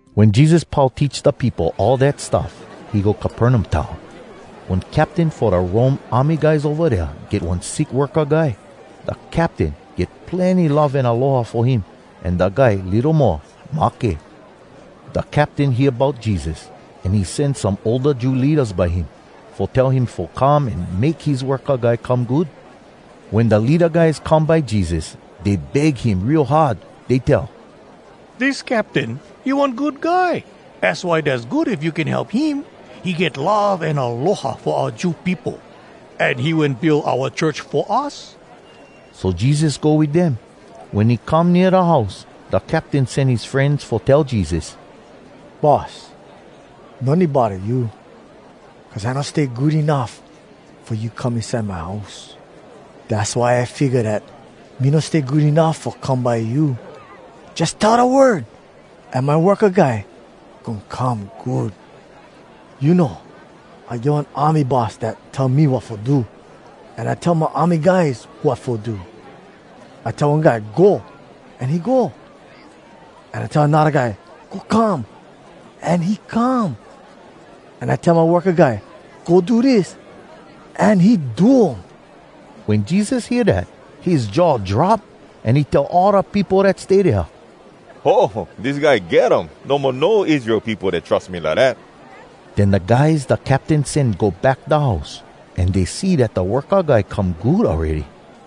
Wen Jesus pau teach da peopo all dat stuff, he go Capernaum town. One captain fo da Rome army guys ova dea get one sick worka guy. Da captain get plenny love an aloha fo him, an da guy litto mo mahke. Da captain hear bout Jesus, an he sen some older Jew leadas by him, fo tell him fo come an make his worka guy come good. Wen da leada guys come by Jesus, dey beg him real hard. Dey tell, “Dis captain, he one good guy. Az why dass good if you can help him. He get love an aloha fo oua Jew peopo, an he wen build oua church fo us.” So Jesus go wit dem. Wen he come nea da house, da captain sen his frenz fo tell Jesus, “Boss, no need bodda you, cuz I no stay good enuff fo you come inside my house. Dass why I figga dat me no stay good enuff fo come by you. Jus tell da word, an my worka guy goin come good. You know, I get one army boss dat tell me wat fo do. An I tell my army guys wat fo do. I tell one guy, ‘Go,’ an he go. An I tell anodda guy, ‘Go come,’ an he come. An I tell my worka guy ‘Go do dis,’ an he do um.” Wen Jesus hear dat, his jaw drop, an he tell all da peopo dat stay dea, “Ho! Dis guy get um! No mo no Israel peopo dat trus me lidat!” Den da guys da captain sen go back da house, an dey see dat da worka guy come good awready.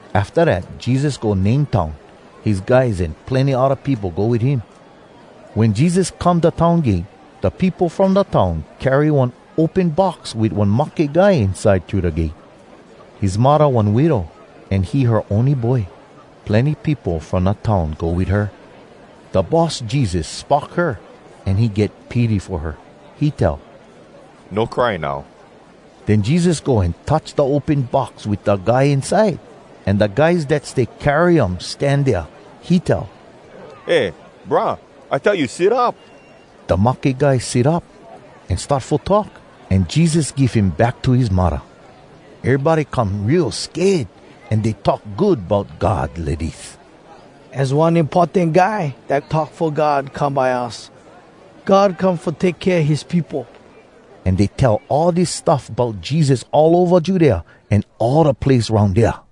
Afta dat Jesus go Nain town. His guys an plenny odda peopo go wit him. Wen Jesus come da town gate, da peopo from da town carry one open box wit one mahke guy inside thru da gate. His muddah one widow, an he her ony boy. Plenny peopo from da town go wit her. Da Boss Jesus spock her, an he get pity fo her. He tell, “No cry now.” Den Jesus go an touch da open box wit da guy inside, an da guys dat stay carry um stan dea. He tell, “Eh, brah, I tell you, sit up!” Da mahke guy sit up, an start fo talk, an Jesus give him back to his muddah. Erybody come real sked, an dey talk good bout God lidis, “Az one importan guy dat talk fo God come by us! God come fo take kea his peopo!” An dey tell all dis stuff bout Jesus all ova Judea an all da place aroun dea.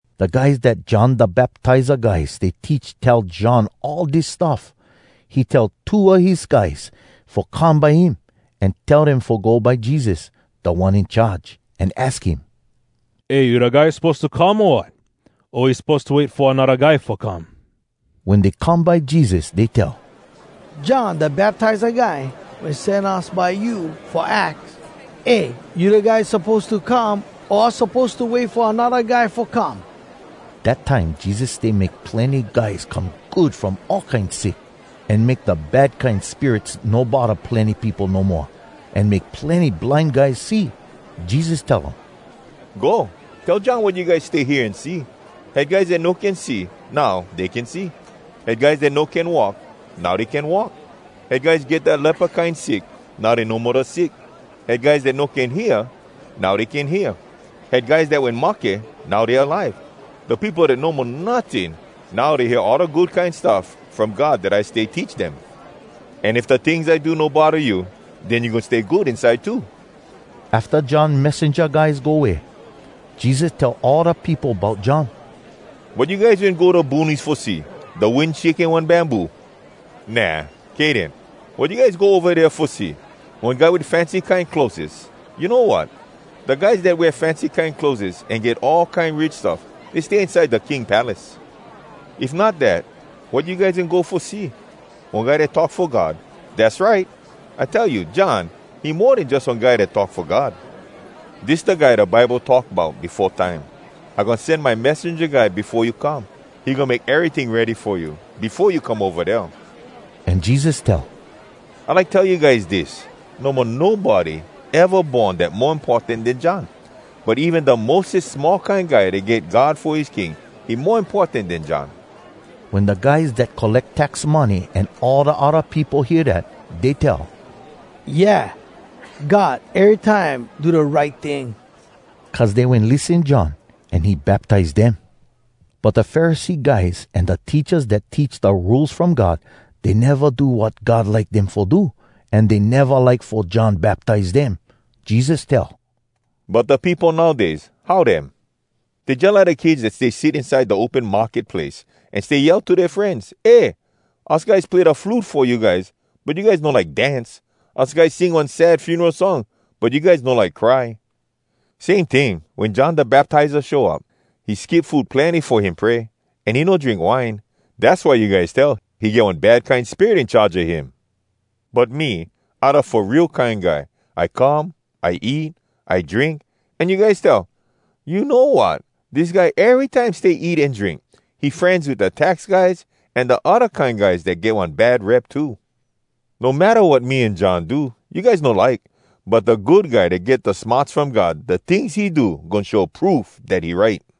Da guys dat John Da Baptiza Guy stay teach tell John all dis stuff. He tell two a his guys fo come by him, an tell dem fo go by Jesus, Da One In Charge, an aks him, “Eh, you da guy suppose to come, o wat? O we suppose to wait fo anodda guy fo come?” Wen dey come by Jesus dey tell, “John Da Baptiza guy wen sen us by you fo aks, ‘Eh, you da guy suppose to come, o us suppose to wait fo anodda guy fo come?’” Dat time Jesus stay make plenny guys come good from all kine sick, an make da bad kine spirits no bodda plenny peopo no moa, an make plenny blind guys see. Jesus tell um, “Go, tell John wat you guys stay hear an see. Had guys dat no can see, now dey can see. Had guys dat no can walk, now dey can walk. Had guys dat get da lepa kine sick, now dey no mo da sick. Had guys dat no can hear, now dey can hear. Had guys dat wen mahke, now dey alive! Da peopo dat no mo notting, now dey hear all da Good Kine Stuff From God dat I stay teach dem. An if da tings I do no bodda you, den you goin stay good inside too.” Afta John messenja guys go way, Jesus tell all da peopo bout John. “Wat you guys wen go da boonies fo see? Da wind shaking one bamboo? Nah! Kay den, wat you guys go ova dea fo see? One guy wit fancy kine clotheses? You know wat? Da guys dat wear fancy kine clotheses an get all kine rich stuffs, dey stay inside da king palace. If not dat, wat you guys wen go fo see? One guy dat talk fo God? Dass right! I tell you, John, he mo den jus one guy dat talk fo God. Dis da guy da Bible talk bout befo time: ‘I goin sen my messenja guy befo you come. He goin make eryting ready fo you, befo you come ova dea.’” An Jesus tell, “I like tell you guys dis: No mo nobody eva born dat mo importan den John. But even da mostes small kine guy dat get God fo his king, he mo importan den John.” Wen da guys dat colleck tax money an all da odda peopo hear dat, dey tell, “Yeah! God erytime do da right ting!” Cuz dey wen lissen John, an he baptize dem. But da Pharisee guys an da teachas dat teach da Rules From God, dey neva do wat God like dem fo do, an dey neva like fo John baptize dem. Jesus tell, “But da peopo nowdays, how dem? Dey jalike da kids dat stay sit inside da open market place, an stay yell to dea frenz, ‘Eh! Us guys play da flute fo you guys, but you guys no like dance! Us guys sing one sad funeral song, but you guys no like cry.’ Same ting, wen John Da Baptiza show up, he skip food plenny fo him pray, an he no drink wine. Dass why you guys tell, ‘He get one bad kine spirit in charge a him!’ But me, I da Fo Real Kine Guy. I come, I eat, I drink, an you guys tell, ‘You know wat? Dis guy erytime stay eat an drink! He frenz wit da tax guys, an da odda kine guys dat get one bad rep too.’ No matta wat me an John do, you guys no like! But da good guy dat get da smarts from God, da tings he do goin show proof dat he right.”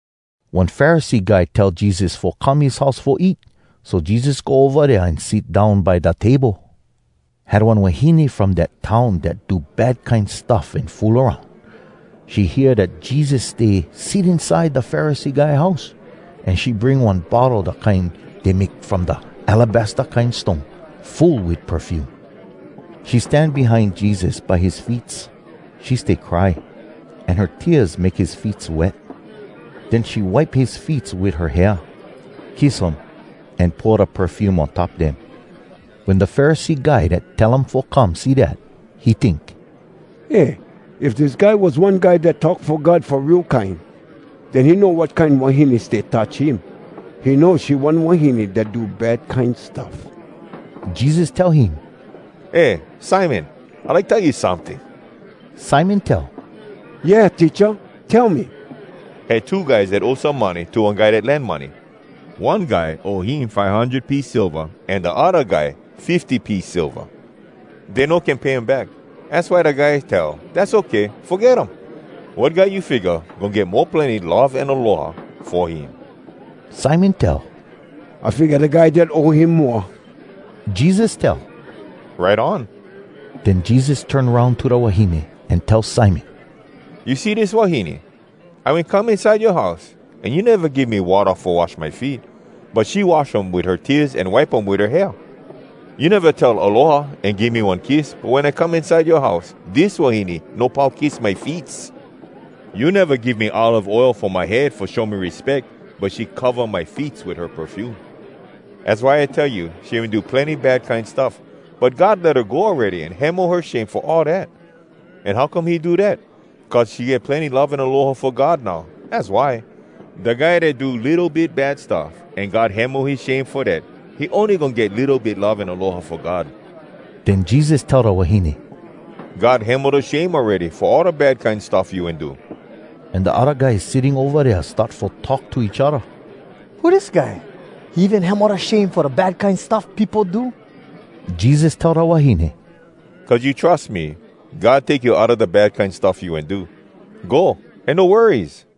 One Pharisee guy tell Jesus fo come his house fo eat. So Jesus go ova dea an sit down by da table. Had one wahine from dat town dat do bad kine stuff an fool aroun. She hear dat Jesus stay sit inside da Pharisee guy house, an she bring one bottle da kine dey make from da alabaster kine stone, full wit perfume. She stan behind Jesus by his feets. She stay cry, an her tears make his feets wet. Den she wipe his feets wit her hair, kiss um, an pour da perfume on top dem. Wen da Pharisee guy dat tell um fo come see dat, he tink, “Eh, if dis guy was one guy dat talk fo God fo real kine, den he know wat kine wahine stay touch him. He know she one wahine dat do bad kine stuff.” Jesus tell him, “Eh Simon, I like tell you someting.” Simon tell, “Yeah, Teacha? Tell me.” “Had two guys dat owe some money to one guy dat lend money. One guy owe him five hundred piece silva, an da odda guy fifty piece silva. Dey no can pay him back. Az why da guy tell, ‘Dass okay. Foget um.’ Wat guy you figga goin get mo plenny love an aloha fo him?” Simon tell, “I figga da guy dat owe him moa.” Jesus tell, “Right on.” Den Jesus turn aroun to da wahine, an tell Simon, “You see dis wahine? I wen come inside yoa house, an you neva give me watta fo wash my feet. But she wash um wit her tears an wipe um wit her hair. You neva tell ‘Aloha’ an give me one kiss, but wen I come inside yoa house, dis wahine no pau kiss my feets. You neva give me olive oil fo my head fo show me respeck, but she cova my feets wit her perfume. Az why I tell you, she wen do plenny bad kine stuff, but God let her go awready an hemo her shame fo all dat. An how come he do dat? Cuz she get plenny love an aloha fo God now, az why. Da guy dat do litto bit bad stuff, an God hemo his shame fo dat, he ony goin get litto bit love an aloha fo God.” Den Jesus tell da wahine, “God hemo da shame awready fo all da bad kine stuff you wen do.” An da odda guys sitting ova dea start fo talk to each odda, “Who dis guy? He even hemo da shame fo da bad kine stuff peopo do!” Jesus tell da wahine, “Cuz you trus me, God take you outa da bad kine stuff you wen do. Go, an no worries.”